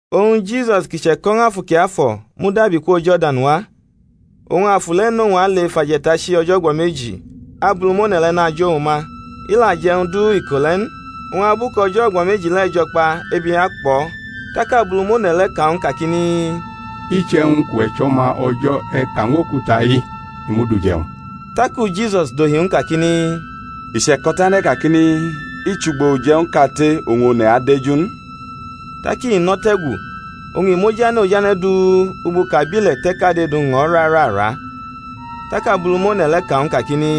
Oñ Jisus, kʼi che̩ko̩ ñw Afu Kiafo̩, mudabi kwo Jordan wa, oñ Afu le̩ nʼowñ ale ef aje̩tachi o̩jo̩ o̩gbo̩ meji Abulumone̩ le̩ najʼowñ ma. I la je̩ e̩wñ du iko le̩ n, oñ abu kʼo̩jo̩ o̩gbo̩ meji le̩ jo̩ kpa ebi akpʼo̩. Tak Abulumone̩ le̩ ka ñw u kakini, Iche̩wñ kʼuwe̩ chʼO̩ma O̩jo̩ e̩ ka ñw okuta-i kʼi mud uje̩wñ. Taku Jisus dohi ñw u kakini, I che̩ko̩ tane̩ kakini, I chʼugbo uje̩wñ kate oñ one̩ adeju n. Tak i nʼo̩ te̩gu oñ i mʼojane̩ ojane̩ du ugbo kʼabile̩ te̩ kade du ñʼo̩ rarara. Tak Abulumone̩ le̩ ka ñw u kakini,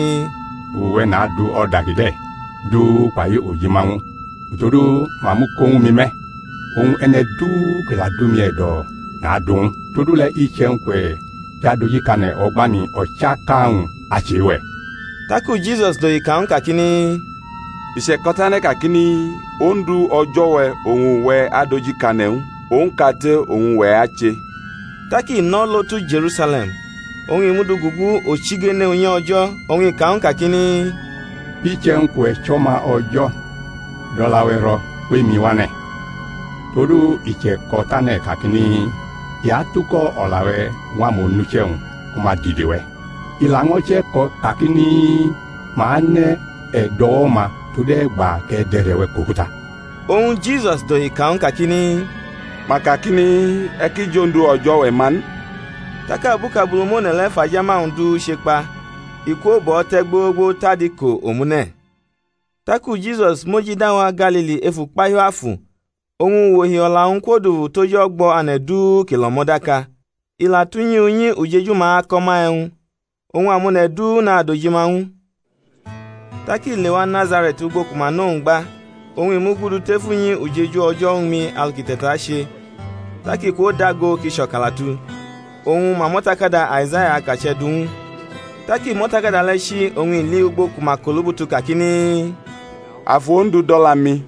Uwe̩ nadu o̩da kide̩ du kpai ojima-wñ ñw u; todu ma mʼu ko ñwu mi me̩, oñ e̩ne̩ du ki la dʼumi e̩do̩ nadu ñw u. Todule̩ iche̩wñ kʼuwe̩ jʼadojikane̩ o̩gba-mi, o̩chaka-wñ achʼe-we̩. Taku Jisus dohi ka ñw u kakini, I che̩ko̩ tane̩ kakini, Ondu, O̩jo̩-we̩, oñ uwe̩ adojikane̩ ñw u, owñ kate oñ uwe̩ ache. Tak i nʼo̩ lo tu Je̩rusale̩m, oñ i mʼu du gugu o̩chigene unyi O̩jo̩, oñ i ka ñw u kakini, Iche̩wñ kʼuwe̩ chʼO̩ma O̩jo̩, dʼo̩la-we̩ ro̩ kwʼemi wʼane̩; todu i che̩ko̩ tane̩ kakini, I atuko̩ o̩la-we̩ ñw amonuche̩-wñ ku ma dide we̩; i laño̩ che̩ko̩ kakini, Ma anʼe̩ e̩do̩wo̩-ma tode̩gba kʼe̩ dʼe̩re̩-we̩ kʼokuta. Oñ Jisus dohi ka ñw u kakini, Ma kakini, E̩ ki jʼOndu O̩jo̩-we̩ ma n. Tak abu kʼAbulumone̩ le̩ fʼajama-wñ du chekpa, i kwo bʼo̩ te̩ gbogbo tʼadiko omune̩. Taku Jisus mojida wa Galili ef ukpahiu Afu; oñ uwohi o̩la-wñ kwodufu tʼoj o̩gbo̩ ane̩ du ki lʼo̩mo̩ daka. I la tʼunyi unyi ujeju-ma ako̩ ma e̩wñ, oñ amone̩ du nadojima ñw u. Tak i lewa Nazare̩t, ugbo ku ma nʼowñ gba; oñ i mugudu tef unyi ujeju o̩jo̩ uñmi alu kʼi te̩tache, tak i kwodago kʼi cho̩kalatu, oñ ma mʼo̩takada Aizaya akache̩ du ñw u. Tak i mʼo̩takada le̩ chi, oñ i li ugbo ku ma kʼolubutu kakini, Afu Ondu dʼo̩la-mi,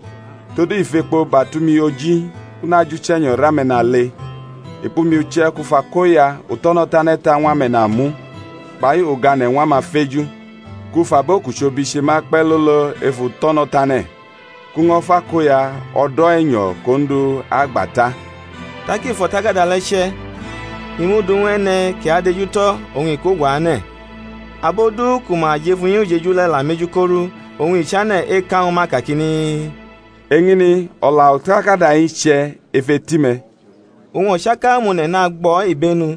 todu i fʼekpo batʼumi oji kʼu najʼuche̩nyo̩ rʼame̩nale; i kpʼumi uche̩ kʼu fʼakoya uto̩no̩-tane̩ ta ñw ame̩namu, kpai ugane̩ ñw amafeju: kʼu fʼabo kʼuchobi che ma kpe̩ lolo ef uto̩no̩tane̩; kʼu ño̩ fʼakoya o̩do̩ e̩nyo̩ kʼOndu agba ta. Tak i fʼo̩takada le̩ che̩, i mʼu du ñw e̩ne̩ ki adejutʼo̩ oñ i kwoguane̩; abo du ku ma jʼef unyi ujeju le̩ la mʼeju korʼu. Oñ i chane̩ eka ñwu ma kakini, Eñini o̩la o̩takada-i che̩ ef eti-me̩. Oñ o̩chaka amone̩ nagbʼo̩ ibenu,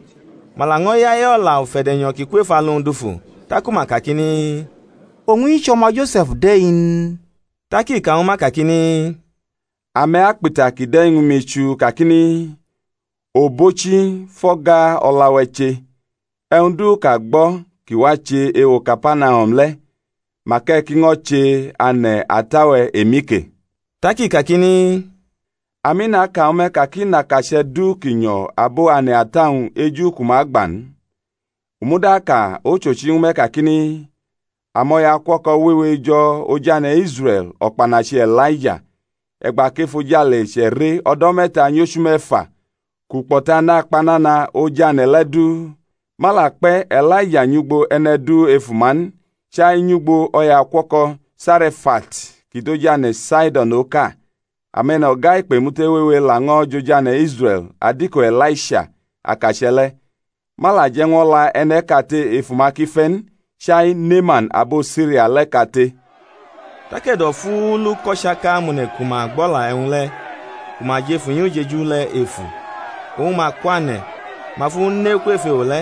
ma laño̩ yaye o̩la ufe̩de̩nyo̩ ki kwʼef alu-wñ dufu; taku ma kakini, Owñ-i chʼo̩ma Jo̩se̩f de̩ n? Tak i ka ñwu ma kakini, Ame̩ akpʼita kide̩ ñwu mi chuu kakini, Obochi, fʼo̩ga o̩la-we̩ che̩; e̩wñ du kʼa gbo̩ ki wache ewo Kapanahum le̩ mak e̩ ki ño̩ che ane̩ ata-we̩ emi ke. Tak i kakini, Ami naka ñwu me̩ ka kʼi nʼakache̩ du ki nyo̩ abo ane̩ ata-wñ eju ku ma agba n. U muda aka ochochi ñwu me̩ kakini, Amo̩yaukuo̩ko̩ wewe jo̩ oj ane̩ Israe̩l o̩kpanachi E̩laija, e̩gba kʼefojale che̩re o̩do̩ me̩ta nyʼochu me̩fa kʼukpo̩ta nakpa nana oj ane̩ le̩ du; ma la kpe̩ E̩laija nyʼugbo e̩ne̩ du ef uma n, chai nyʼugbo o̩yaukuo̩ko̩ Sare̩fat ki dʼoj ane̩ Saido̩n oka. Ame̩no̩ga ikpemute wewe laño̩ jʼoj ane̩ Israe̩l adiko E̩laisha akache̩ le̩; ma la je̩ ñw o̩la e̩ne̩ kate ef uma ki fe̩ n, chai Neaman abo Siria le̩ kate. Tak e̩do̩fuulu kʼo̩chaka amone̩ ku ma gbʼo̩la e̩wñ le̩ ku ma jʼef unyi ujeju le̩ efu; oñ ma kwane̩, ma fʼu ne kwef ewo le̩,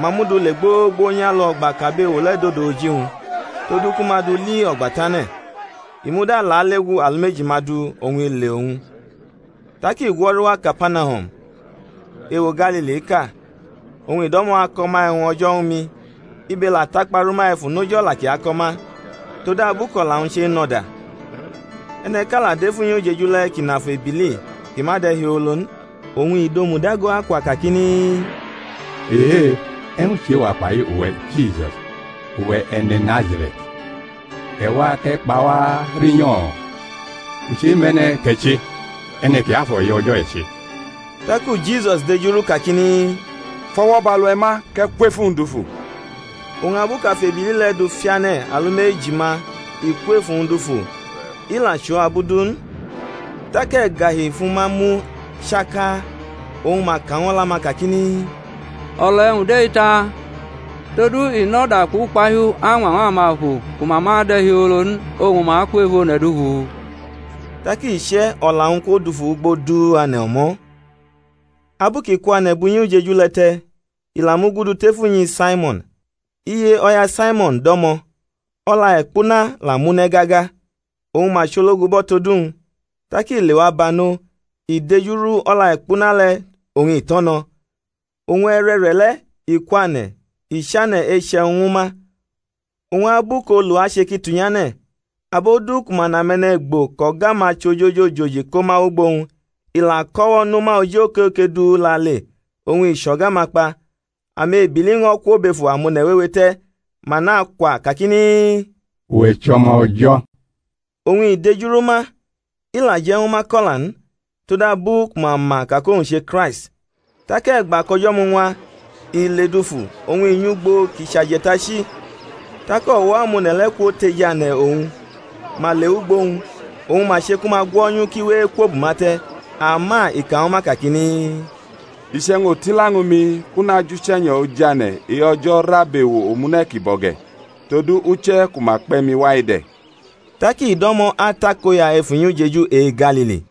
ma mʼu du le gbogbo nyʼalu o̩gba kʼabewo le̩ dodo oji-wñ, todu ku ma dʼu li o̩gba tane̩. I muda lalegu alumeji-ma du oñ i le owñ. Tak i gwo̩ru wa Kapanahum ewo Galiliʼka, oñ i do̩mo̩ ako̩ ma e̩wñ o̩jo̩ uñmi; ibe la takpa rʼuma efu noj o̩la kʼi ako̩ ma, todabu kʼo̩la-wñ chenʼo̩da. E̩ne̩ʼka la dʼef unyi ujeju le̩ kʼi nʼafu ebili ki ma de̩hiolo n; oñ i dʼomu dago akwa kakini, Ehe! e̩wñ chʼe-wa kpai uwe̩, Jisus, uwe̩ e̩ne̩ Nazare̩t? E̩ wa kʼe̩ kpa wa rinyo̩? U chemʼe̩ne̩ kʼe̩ che, E̩ne̩ Kiafo̩ e-O̩jo̩ e̩ che. Taku Jisus dejurʼu kakini, Fʼo̩wo̩ bʼalu-we̩ ma, kʼe̩ kwʼef uwñ dufu! Oñ abu kʼebili le̩ mʼu dufiane̩ alumeji ma i kwʼef uwñ dufu, i la chʼo abu du n. Tak e̩gahi fʼuma mu chaka, oñ ma ka ñw o̩la-ma kakini, O̩la e̩wñ de̩-i ta? Todu i nʼo̩da kpʼukpahiu añwañw amafu ku ma ma de̩hiolo n oñ ma kwʼef one̩ dufu? Tak iche̩ o̩la-wñ kwodufu ugbo du ane̩ o̩mo̩. Abu kʼi kwane̩ bʼunyi ujeju le̩ te̩ i la mugudu tef unyi Saimo̩n. Iye o̩ya Saimo̩n do̩mo̩, o̩la-e̩kpuna la mʼu ne̩ gaga; oñ ma chologubʼo̩ tod uwñ. Tak i lewa banʼo, i dejuru o̩la-e̩kpuna le̩ oñ i tʼo̩ no̩; oñ e̩re̩re̩le̩ i kwane̩ i chane̩ eche̩wñ ñwu ma. Oñ abu kʼolu ache ki tunyane̩, abo du ku ma nʼame̩ne̩gbo kʼo̩ga-ma chʼojoji ojoji ko ma wʼugbo-wñ; i la ko o̩wo̩ nʼuma oji okoke du lale, oñ i chʼo̩ga ma kpa. Amebili ño̩ kwo bʼefu amone̩ wewe te̩, ma nakwa kakini, Uwe̩ chʼO̩ma O̩jo̩! Oñ i dejuru ma, i la je̩ ñwu ma ko̩la n, todabu ku ma ma ka kʼowñ che Kraist. Tak e̩gba kʼo̩jo̩ muñwa, i ledufu, oñ i nyʼugbo ki chʼaje̩tachi; tak o̩wo̩ amone̩ le̩ kwotejane̩ owñ, ma le wʼugbo owñ, oñ ma che ku ma gwo̩nyʼu kʼi we ekwobʼuma te̩. Ama i ka ñwu ma kakini, I chʼe̩wñ otila ñwu mi kʼu najʼuche̩nyo̩ ojane̩ e-O̩jo̩ rʼabewo omune̩ kibo̩ ge̩; todu uche̩ ku ma kpe̩ mi wa-i de̩. Tak i do̩mo̩ atakoya ef unyi ujeju e-Galili.